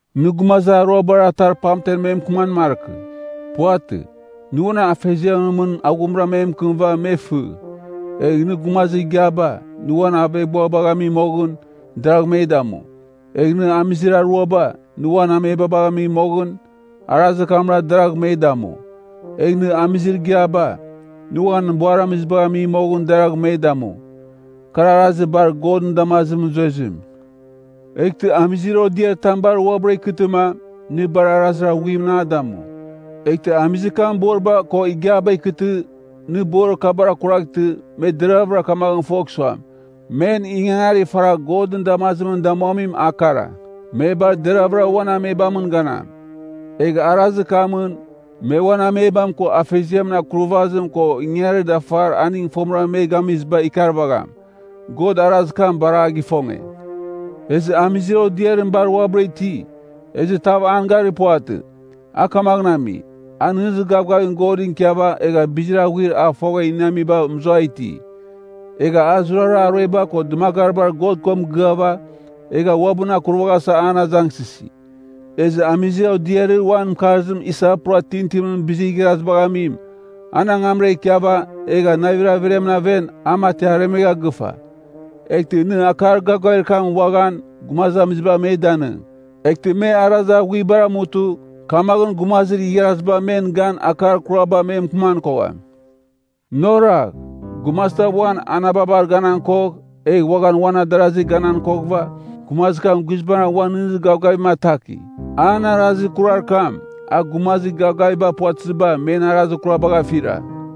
Nɨ gumazir aruabar atar pamten me mɨkɨman markɨ. Puvatɨ, nɨ uan afeziamɨn mɨn aghumra me mɨkɨmɨva me fɨ. Egh nɨ gumazir igiaba, nɨ uan aveghbuabagh ami moghɨn, deragh me damu. Egh nɨ amizir aruaba, nɨ uan amebam gami moghɨn, arazir kamra deragh me damu. Egh nɨ amizir igiaba, nɨ uan buaramizibagh ami moghɨn, deragh me damu. Kar arazir bar Godɨn damazimɨn zuezim. Eghtɨ amizir odiaritam bar uabɨra ikɨtɨma, nɨ bar arazir aghuimɨn a damu. Eghtɨ amizir kam boriba ko igiaba ikɨtɨ, nɨ borir kabar akurvaghtɨ, me deraghvɨra kamaghɨn fogh suam, men ingangarir faragh Godɨn damazimɨn damuamim a kara, me bar deraghvɨra uan amebamɨn ganam. Egh arazir kamɨn, me uan amebam ko afeziamɨn akurvazim ko ingangarir dafar aning fomɨra me gamiziba ikarvagham. God arazir kam bar a gifonge. Ezɨ amizir odiarim bar uabɨra iti, ezɨ tav an garir puvatɨ, a kamaghɨn ami, a nɨghnɨzir gavgavim Godɨn ikiava egha bizir aghuir a fogha iniamiba mɨzua iti. Egha a zurara arueba ko dɨmagaribar God ko mɨgɨava, egha uabɨn akurvaghasa an azangsɨsi. Ezɨ amizir odiarir uan mɨkarzim isa pura tintinimɨn bizir igharazibagh amim, an angamra ikiava, egha navir averiamɨn aven, a mati aremegha gɨfa. Eghtɨ nɨ akar gavgavir kam uaghan, gumazamiziba me danɨng, eghtɨ me arazir aghuibar amutɨ, kamaghɨn gumazir igharaziba men gan akar kuraba me mɨkɨman kogham. Nɨ oragh. Gumazitam uan anababar ganan kogh, egh uaghan uan adarazir ganan koghɨva, gumazir kam guizbangɨra uan nɨghnɨzir gavgavim ataki. An arazir kurar kam, a gumazir gavgavim puvatɨziba, men arazir kurabagh afira.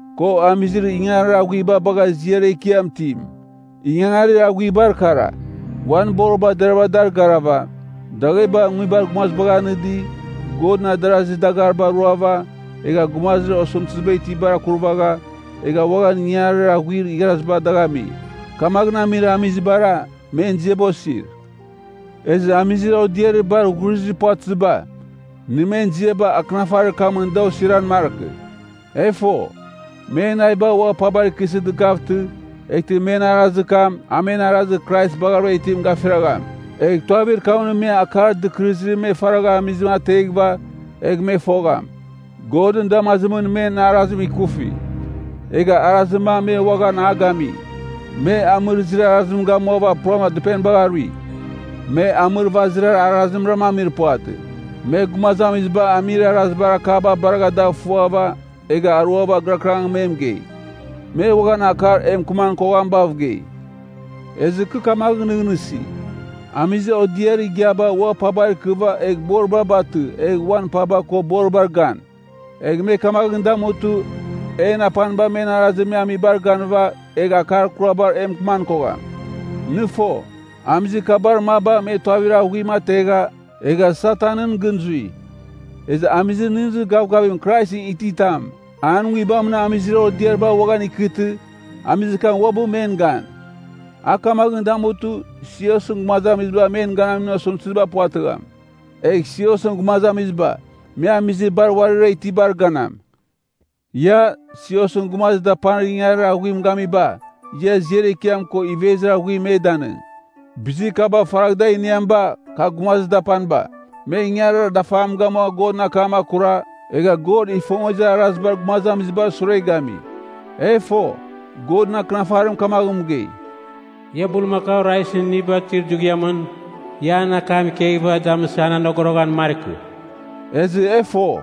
ko amizir ingangarir aghuiba bagha ziar ekiam itim. Ingangarir aghuibar akara, uan boriba deravɨra dar garava, dagheba nguibar gumazibagh anɨdi, Godɨn adarazir dagariba ruava, egha gumazir osɨmtɨziba itibar akurvagha, egha uaghan ingangarir aghuir igharaziba dagh ami. Kamaghɨn amir amizibara, men ziaba osir. Ezɨ amizir odiarir bar ghurizir puvatɨziba, nɨ men ziaba akɨnafarir kamɨn da osiran markɨ. E fo, men naviba ua pabar ikɨsɨ dɨkavtɨ eghtɨ men arazir kam, a men arazir Krais baghavɨra itim gafiragham. Egh tuavir kamɨn me akar dɨkɨrɨzir me faragha amizim ateghɨva, egh me fogham, Godɨn damazimɨn men arazim ikufi. Egha arazir mam me uaghan a gami. Me amɨrɨzir arazim gamuava pura dɨpenibagh arui. Me amɨrvazir arazimra amir puvatɨ, me gumazamiziba amir arazibar akaba baragha dagh ifuava, egha aruava gɨrakɨrangɨn me mɨgei. Me uaghan akar e mɨkɨman koghamibav gei. Ezɨ kɨ kamaghɨn nɨghnɨsi, amizir odiarir igiaba ua pabar ikɨva egh boriba batɨ egh uan paba ko boribar gan. Egh me kamaghɨn damutɨ, en apaniba men arazir me amibar ganɨva, egh akar kurabar e mɨkɨman kogham. Nɨ fo, amizir kabar maba me tuavir aghuim ategha, egha Satanɨn gɨn zui. Ezɨ amizir nɨghnɨzir gavgavim Kraisɨn ititam, an nguibamɨn amizir odiariba uaghan ikɨtɨ, amizir kam uabɨ men gan. A kamaghɨn damutɨ, siosɨn gumazamiziba men ganamin osɨmtɨziba puvatɨgham. Egh siosɨn gumazamiziba, me amizir bar uarira itibar ganam. Ia, siosɨn gumazir dapanir ingangarir aghuim gamiba, ia ziar ekiam ko ivezir aghuim me danɨng. Bizir kaba faragh da iniamiba, kar gumazir dapaniba, me ingangarir dafam gamua Godɨn akam akura, egha God ifongezir arazibar gumazamizibar sure gami. E fo, Godɨn Akɨnafarim kamaghɨn mɨgei, “Ia, bulmakau raizɨn iniba tuir dughiamɨn, ia an akam ikeghɨva damɨsɨ an anogoroghan markɨ.” Ezɨ e fo,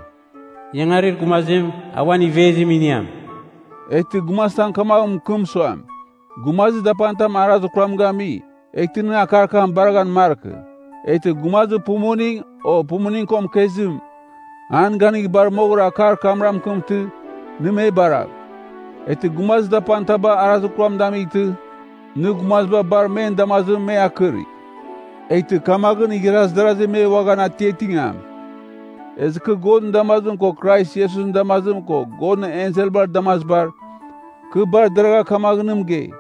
“Ingangarir gumazim, a uan ivezim iniam.” Eghtɨ gumazitam kamaghɨn mɨkɨm suam, gumazir dapanitam arazir kuram gami, eghtɨ nɨ akar kam baraghan markɨ. Eghtɨ, gumazir pumuning, o pumuning ko mɨkezim, an ganigh bar moghɨra akar kamra mɨkɨmtɨ, nɨ me baragh. Eghtɨ gumazi dapanitaba arazir kuram damightɨ, nɨ gumaziba bar men damazimɨn me akɨrigh. Eghtɨ kamaghɨn igharaz darazi me uaghan atiatingam. Ezɨ kɨ Godɨn damazim ko Krais Iesusɨn damazim ko Godɨn enselbar damazibar, kɨ bar deragha kamaghɨn nɨ mɨgei,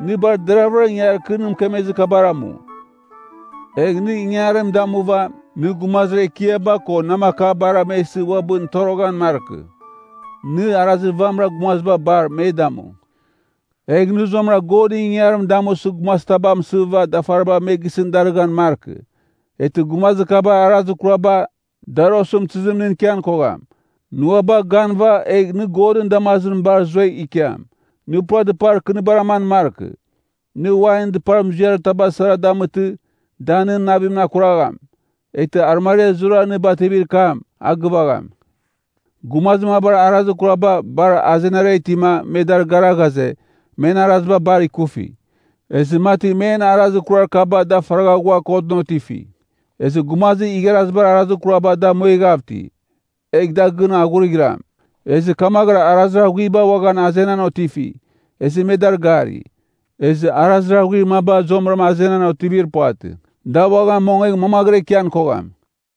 nɨ bar deravɨra ingangarir kɨ nɨ mɨkemezir kabar amu. Egh nɨ ingangarim damuva, nɨ gumazir ekiaba ko namakabara me isɨ uabɨn toroghan markɨ. Nɨ arazir vamɨra gumaziba bar, me damu. Egh nɨ zuamɨra Godɨn ingangarim damusɨ gumazitaba amsɨva dafariba me gisɨn darɨghan markɨ. Eghtɨ gumazir kabar arazir kuraba, dar osɨmtɨzim nɨn ikian kogham. Nɨ ua bagh ganɨva, egh nɨ Godɨn damazimɨn bar zuegh ikiam. Nɨ pura dɨpar kɨnibar aman markɨ. Nɨ wainɨn dɨpar muziarir taba sara damɨtɨ, da nɨn navimɨn akuragham. Eghtɨ arɨmariar zurara nɨ bativir kam, a gɨvagham. Gumazir mabar arazir kuraba, bar azenara itima, me dar gara ghaze, men araziba bar ikufi. Ezɨ mati men arazir kurar kaba da faragha ghua kotɨn otifi. Ezɨ gumazir igharazibar arazir kuraba da mueghav iti. Egh gɨn da aghurighɨram. Ezɨ kamaghɨra arazir aghuiba uaghan azenan otifi, ezɨ me dar gari. Ezɨ arazir aghuir maba zuamɨra azenan otivir puvatɨ, da uaghan mongegh mamaghɨra ikian kogham.